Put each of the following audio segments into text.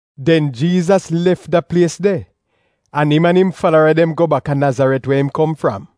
Den Jiizas lef da plies de an im an im falara dem go bak a Nazaret we im kom fram.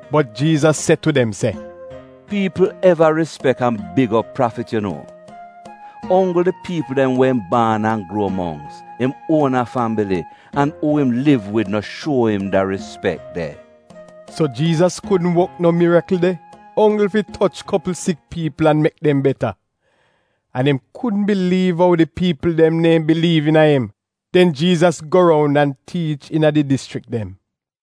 Bot Jiizas se tu dem se, “Piipl eva rispek an big op prafit yu nuo, onggl di piipl dem we im baan an gruo mongks — im uona fambili an uu im liv wid no shuo im da rispek de.” So Jiizas kudn wok no mirikl de, onggl fi toch kopl sik piipl an mek dem beta. An im kudn biliiv ou di piipl dem neehn biliiv iina im. Den Jiizas go roun an tiich iina di dischrik dem.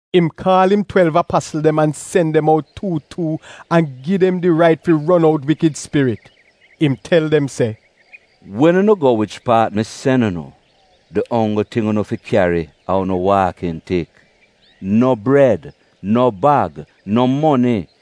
Im kaal im twelv apasl dem an sen dem out tuu tuu an gi dem di rait fi ron out wikid spirit. Im tel dem se, “Wen unu a go wich paat mi sen unu, di onggl ting unu fi kyari a unu waakin tik — no bred, no bag, no moni —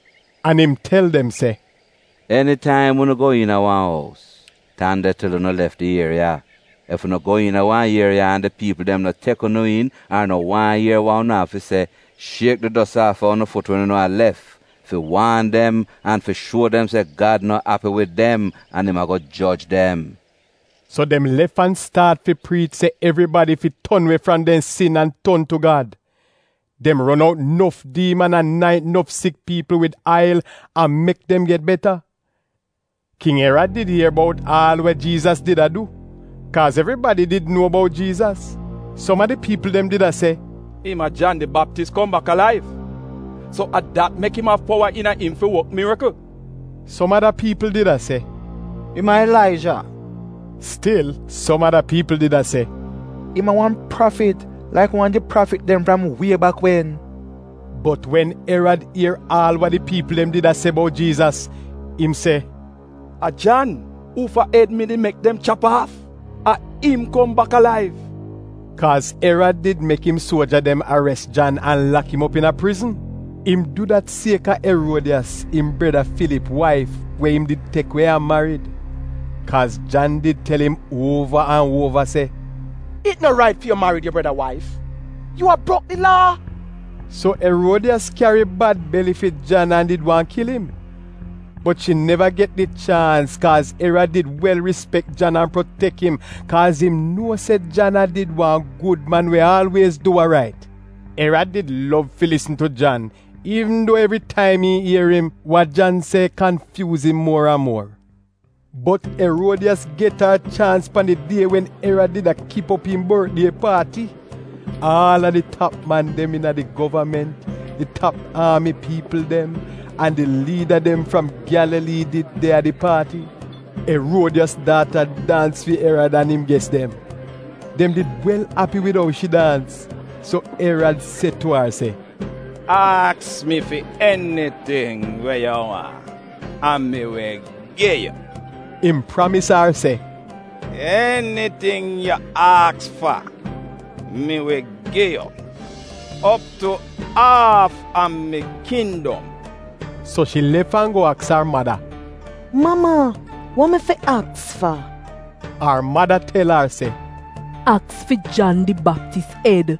An im tel dem se, “Enitaim unu go iina wan ous, tan de til unu lef di ieriya. Ef unu go iina wan ieriya an di piipl dem no tek unu iin ar no waahn ier wa unu av fi se, shiek di dos aafa unu fut wen unu a lef fi waan dem an fi shuo dem se Gad no api wid dem an im ago joj dem.” So dem lef an staat fi priich se evribadi fi ton we fram dem sin an ton tu Gad. Dem ron out nof diiman an naint nof sik piipl wid ail an mek dem get beta. King Erad did ier bout aal wa Jiizas did a du, kaaz evribadi did nuo bout Jiizas. Som a di piipl dem did a se, “Im a Jan di Baptis kom bak alaiv, so a dat mek im av powa iina im fi wok mirikl.” Som ada piipl did a se, “Im a Ilaija!” Stil som ada piipl did a se, “Im a wan prafit, laik wan a di prafit dem fram wie bak wen.” Bot wen Erad ier aal wa di piipl dem did a se bout Jiizas, im se, “A Jan, uufa ed mi did mek dem chap aaf, a im kom bak alaiv!” Kaaz Erad did mek im suoja dem ares Jan an lak im op iina prizn. Im du dat kaaz a Eruodiyas, im breda Filip waif, we im did tek we an marid. Kaaz Jan did tel im uova an uova se, “It no rait fi yu marid yu breda waif — yu a brok di Laa.” So Eruodiyas kyari bad beli fi Jan an did waahn kil im. Bot shi neva get di chaans kaaz Erad did wel rispek Jan an protek im, kaaz im nuo se Jan a did wa gud man we aalwiez du wa rait. Erad did wel lov fi lisn tu Jan, iivn duo evri taim im ier im, wa Jan se kanfyuuz im muor an muor. Bot Eruodiyas get ar chaans pan di die wen Erad did a kip op im bortdie paati. Aal a di tap man dem iina di govament, di tap aami piipl dem, an di liida dem fram Gyalalii did de a di paati. Eruodiyas daata daans fi Erad an im ges dem. Dem did wel api wid ou shi daans. So Erad se tu ar se, “Aks mi fi eniting we yu waahn an mi wi gi yu.” Im pramis ar se, “Eniting yu aks fa mi wi gi yu, op tu aaf a mi kindom.” So shi lef an go aks ar mada, “Mama, wa mi fi aks fa?” Ar mada tel ar se, “Aks fi Jan di Baptis ed.”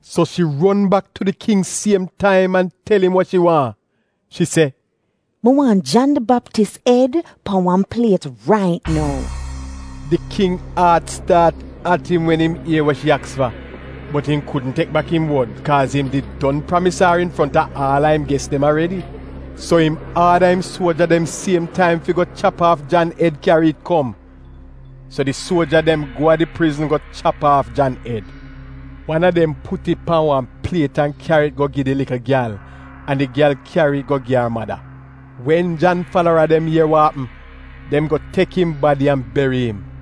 So shi ron bak tu di king siem taim an tel im wa shi waahn. Shi se, “Mi waahn Jan di Baptis ed pan wan pliet rait nou!” Di king aat staat at im wen im ier wa shi aks fa, bot im kudn tek bak im wod, kaaz im did don pramis ar infronta aal a im ges dem aredi. So im aada im suoja dem siem taim fi go chap aaf Jan ed kyari it kom. So di suoja dem go a di prizn go chap aaf Jan ed. Wan a dem put it pan wan pliet an kyari it go gi di likl gyal an di gyal kyari it go gi ar mada. Wen Jan falara dem ier wa apm, dem go tek im badi an beri im.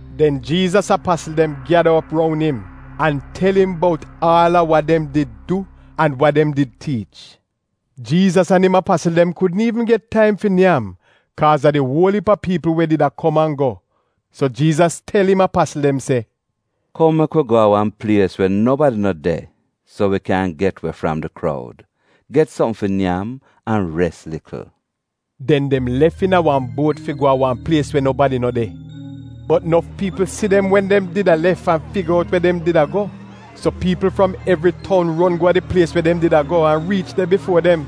Den Jiizas apasl dem gyada op roun im an tel Im bout aal a wa dem did du an wa dem did tiich. Jiizas an im apasl dem kudn iivn get taim fi nyam, kaaz a di uol iip a piipl we did a kom an go, so Jiizas tel im apasl dem se, “Kom mek wi go a wan plies we nobadi no de so wi kyan get we fram di kroud, get sopm fi nyam an res likl.” Den dem lef iina wa buot fi go a wa plies we nobadi no de. Bot nof piipl si dem wen dem did a lef an figa out we dem did a go. So piipl fram evri toun ron go a di plies we dem did a go an riich de bifuo dem.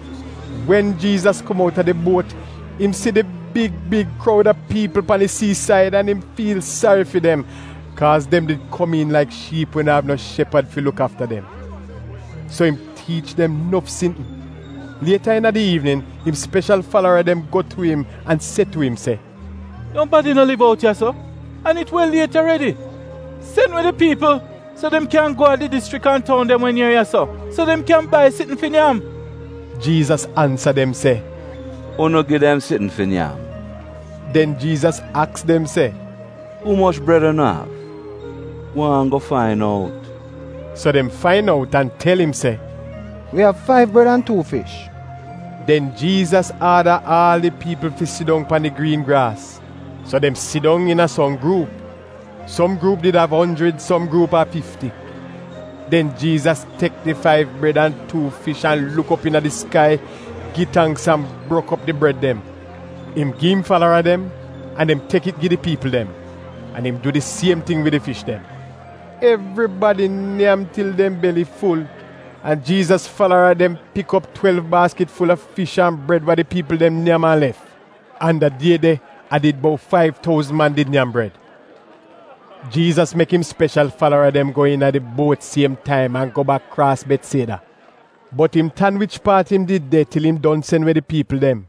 Wen Jiizas kom outa di buot, im si di big big kroud a piipl pan di siisaid an im fiil sari fi dem, kaaz dem did komiin laik shiip we no av no shepad fi luk aafa dem. So im tiich dem nof sitn. Liet iina di iivnin im speshal falara dem go tu im an se tu im se, “Nobadi no liv out ya-so an it wel liet aredi. Sen we di piipl so dem kyan go a di dischrik an toun dem we nier ya-so, so dem kyan bai sitn fi nyam. Jiizas ansa dem se, “Unu gi dem sitn fi nyam.” Den Jiizas aks dem se, “Umoch bred unu av? Gwaan go fain out.” So dem fain out an tel im se, “Wi av faiv bred an tuu fish.” Den Jiizas aada aal di piipl fi sidong pan di griin graas. So dem sidong iina som gruup, som gruup did av onjrid, som gruup a fifti. Den Jiizas tek di faiv bred an tuu fish an luk op iina di skai, gi tangks an brok op di bred dem. Im gi im falara dem, an dem tek it gi di piipl dem. An im du di siem ting wid di fish dem. Evribadi nyam til dem beli ful, an Jiizas falara dem pik op twelv baaskit ful-a fish an bred wa di piipl dem nyam an lef. An da die de a did bout faiv touzn man did nyam bred. Jiizas mek im speshal falara dem go iina di buot siem taim an go bak kraas Betsieda. Bot im tan wich paat im did de til im don sen we di piipl dem.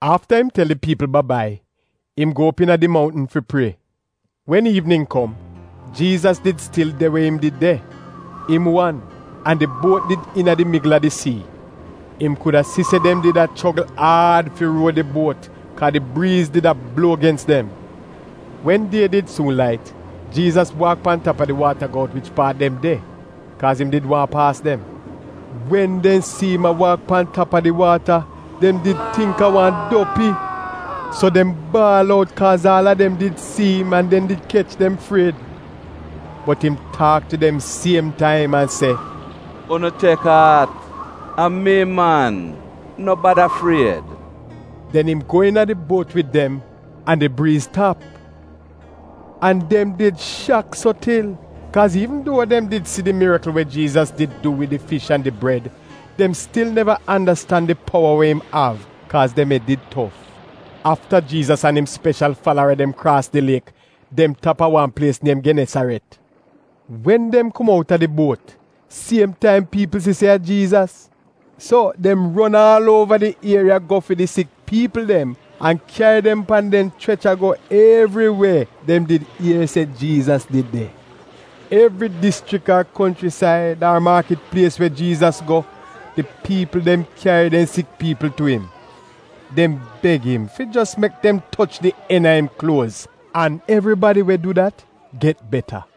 Afta im tel di piipl ba-bai, im go op iina di mountn fi prie. Wen iivnin kom Jiizas did stil de we im did de, im wan, an di buot did iina di migl a di sii. Im kuda si se dem did a chrogl aad fi ruo di buot kaaz di briiz did a bluo gens dem. Wen die did suun lait, Jiizas waak pan tap a di waata go out wich paat dem de, kaaz im did waahn paas dem. Wen dem si im a waak pan tap a di waata, dem did tingk a wan dopi. So dem baal out, kaaz aal a dem did si im an dem did kech dem fried. Bot im taak tu dem siem taim an se, “Unu tek aat! A mi, man. No bada fried.” Den im go iina di buot wid dem, an di briiz tap. An dem did shak so til, kaaz iivn duo dem did si di mirikl we Jiizas did du wid di fish an di bred, dem stil neva andastan di powa we im av, kaaz dem ed did tof. Afta Jiizas an im speshal falara dem kraas di liek, dem tap a wan plies niem Genesaret. Wen dem kom out a di buot, siem taim piipl si se a Jiizas. So dem ron aal uova di ieriya go fi di sik piipl dem an kyari dem pan dem chrecha go evri we dem did ier se Jiizas did de. Evri dischrik ar konchrisaid, ar maakit plies we Jiizas go, di piipl dem kyari dem sik piipl tu im. Dem beg im fi jos mek dem toch di en a im kluoz, an evribadi we du dat get beta.